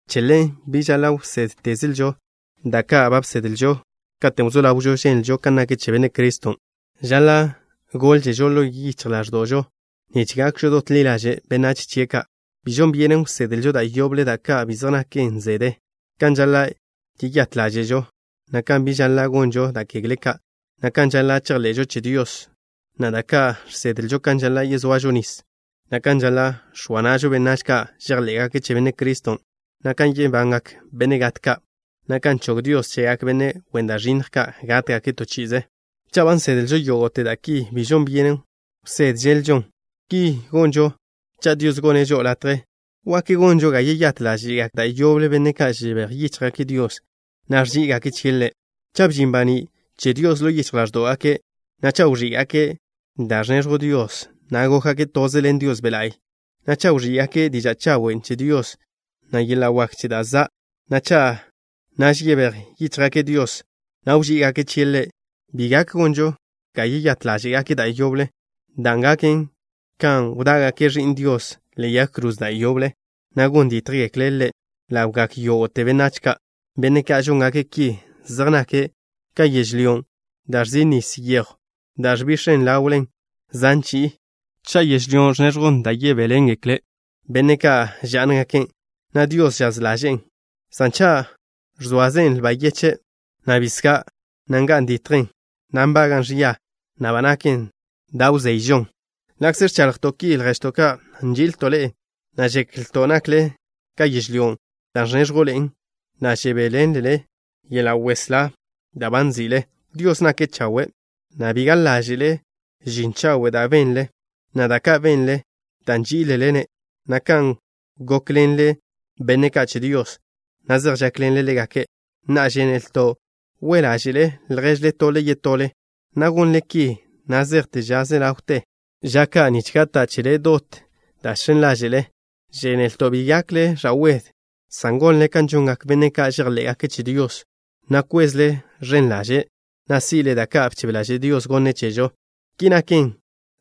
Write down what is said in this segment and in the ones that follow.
Che ḻen, bi žaḻa' wsédtezlžo da' ka' ba bsedlžo katen' wzó ḻawžo ženlžo kan nak che Benne' Criston'. Žaḻa' gólžežo ḻo yichj ḻáẕdo'žo nich gakžo dot ḻi ḻaže' benách chie' ka'. Bi žon byenen wsedlžo da' yoble da' ka' bi zej naken zede: kan žaḻa' yeyát ḻáže'žo, na' kan biž žaḻa' gonžo da' kegle ka', na' kan žaḻa' chejḻe'žo che Dios, na' da' ka' žsedlžo kan žaḻa' yezoažo nis, na' kan žaḻa' x̱oa na'žo benách ka' žejḻé'gake' che Benne' Criston', na' kan yebangak benne' gat ka', na' kan chog Dios chegak benne' wen da' ẕinnj ka' gátgake' to chi'ize. Cha' ba nsedlžo yógo'te da' ki bi žon byenen wsédželžon. Ki gonžo cha' Dios gonne' žo'o latje. ¿Wak gonžo ga yeyát ḻáže'gak da' yoble benne' ka' žebéj yíchjgake' Dios, na' ẕží'igake' chie' Ḻe'? Cha' bžin baní' che Dios ḻo yichj ḻáẕdo'gake', na' cha' wẕí'gake' da' ẕneẕjw Dios, na' gókgake' toze ḻen Dios Be' La'y, na' cha' wẕí'gake' diža' chawen' che Dios, na' yeḻa' wak che da' za', na' cha' naž yebéj yíchjgake' Dios, na' wží'igake' chie' Ḻe', bi gak gonžo ga yeyát ḻáže'gake' da' yoble, dan' gaken kan wdá'gake' Ẕi'n Dios ḻe'e yag kroze da' yoble, na' gon dítjgekle' Ḻe' ḻawgak yógo'te benách ka'. Benne' ka' žóngake' ki zej nake' ka yežlyón' da' ẕzin' nis yejw da' ẕbix̱en ḻawlen zan chi'i. Cha' yežlyón' ẕneẕjwn da' yebéḻengekle benne' ka' žá'ngaken', na' Dios žaz ḻaže'en, san cha' ẕzoazen lba yeche', na' bisgá', na' nga'n ditjen, na' nbaga'n ẕia, na' ba naken da' wzeyžon. Ḻa'kze ẕchaḻjto' ki, lježto' ka', nži'ilto' ḻe'e, na' žeklto' nakle ka yežlyón' da' ẕnéẕjwḻe'en, na' žebéḻenlele yeḻa' weslá da' ba nzi'le. Dios nake' chawe', na' bi gaḻ ḻaže'e žin chawe' da' benle, na' da' ka' benle dan' nží'ilele-ne', na' kan gókḻenle benne' ka' che Dios, na' zej žákḻenle ḻégake'. Na'a, žénelto' we' ḻáže'le lježle tole yetole, na' gonle ki na' zejte ža ze ḻawte ža ka', nich gata' chele dot da' žx̱en ḻáže'le. Žénelto' bi gakle ẕa'wed, san gonle kan žongak benne' ka' žejḻé'gake' che Dios, na' kwezle ẕen ḻaže', na' si'le da' ka' bchebe ḻaže' Dios gonne' chežo. Ki naken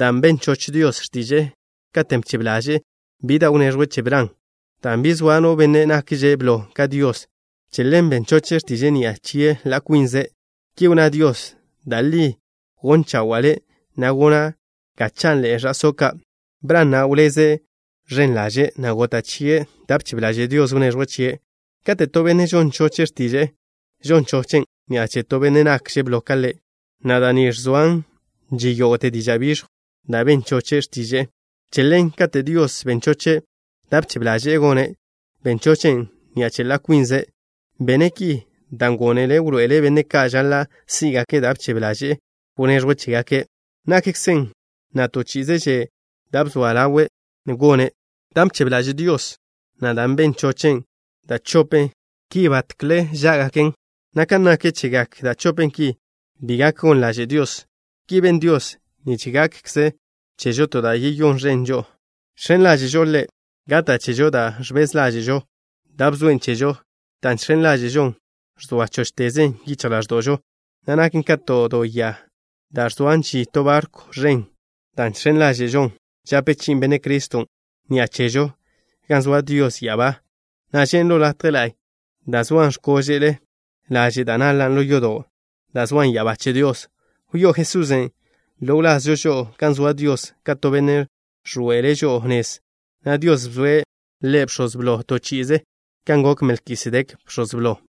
dan' ben choch Dios x̱tiže'e katen' bchebe ḻaže'e bi da' wneẕjwe' che Bran. Dan' bi zoa no benne' nakže' blo ka Dios, che ḻen ben choche' x̱tiže'e ni'a che ḻa' kwinze'. Ki wnná Dios: “Da' li gon chawa'a le', na' gona' ga chanḻe'e ẕa'só' ka'.” Bran na' wleze' ẕen ḻaže', na' gota' chie' da' bchebe ḻaže' Dios wneẕjwe' chie'. Kate' to benne' žon choche' x̱tiže'e, žon chochen' ni'a che to benne' nakže' blo ka ḻe', na' da' ni ẕzoa žin yógo'te diža' biẕjw, dan' ben choche' x̱tiže'e. Che ḻen katen' Dios ben choche' da' bchebe ḻaže'e gone', ben chochen' ni'a che ḻa' kwinze'. Bene' ki dan' gónele' wḻoe'ele' benne' ka' žaḻa' sí'gake' da' bchebe ḻaže'e wneẕjwe' chégake', nakkzen, na' to chi'ize že' da' bzoa ḻawe' gone'. Dan' bchebe ḻaže' Dios, na' dan' ben chochen', da' chopen ki batkle chá'gaken, na' kan nak chegak da' chopen ki, bi gak gon ḻaže' Dios. Ki ben Dios nich gakkzen chežo to da' yeyón ẕen žo'o. Žx̱en ḻáže'žo Ḻe', gata' chežo da' ẕbez ḻáže'žo dan' bzoen' chežo. Dan' žx̱en ḻáže'žon ẕzoa chóchtezen yichj ḻáẕdo'žo, na' naken ka to do ya da' ẕzoa žin to barkw ẕen. Dan' žx̱en ḻáže'žon žape chi'i Benne' Criston' ni'a chežo gan zoa Dios ya'abá, na' žen' ḻo latje la'y dan' zoan x̱kóže'le laže' da' naḻan' ḻo yodon' da' zoan ya'abá che Dios. Wyó'o Jesusen' ḻo wlazžo žo'o gan zoa Dios ka to benne' ẕḻoe'ele' žo'o nez, na' Dios bzoe' Ḻe' Bx̱oz Blo to chi'ize kan gok Melkisedek bx̱oz blo.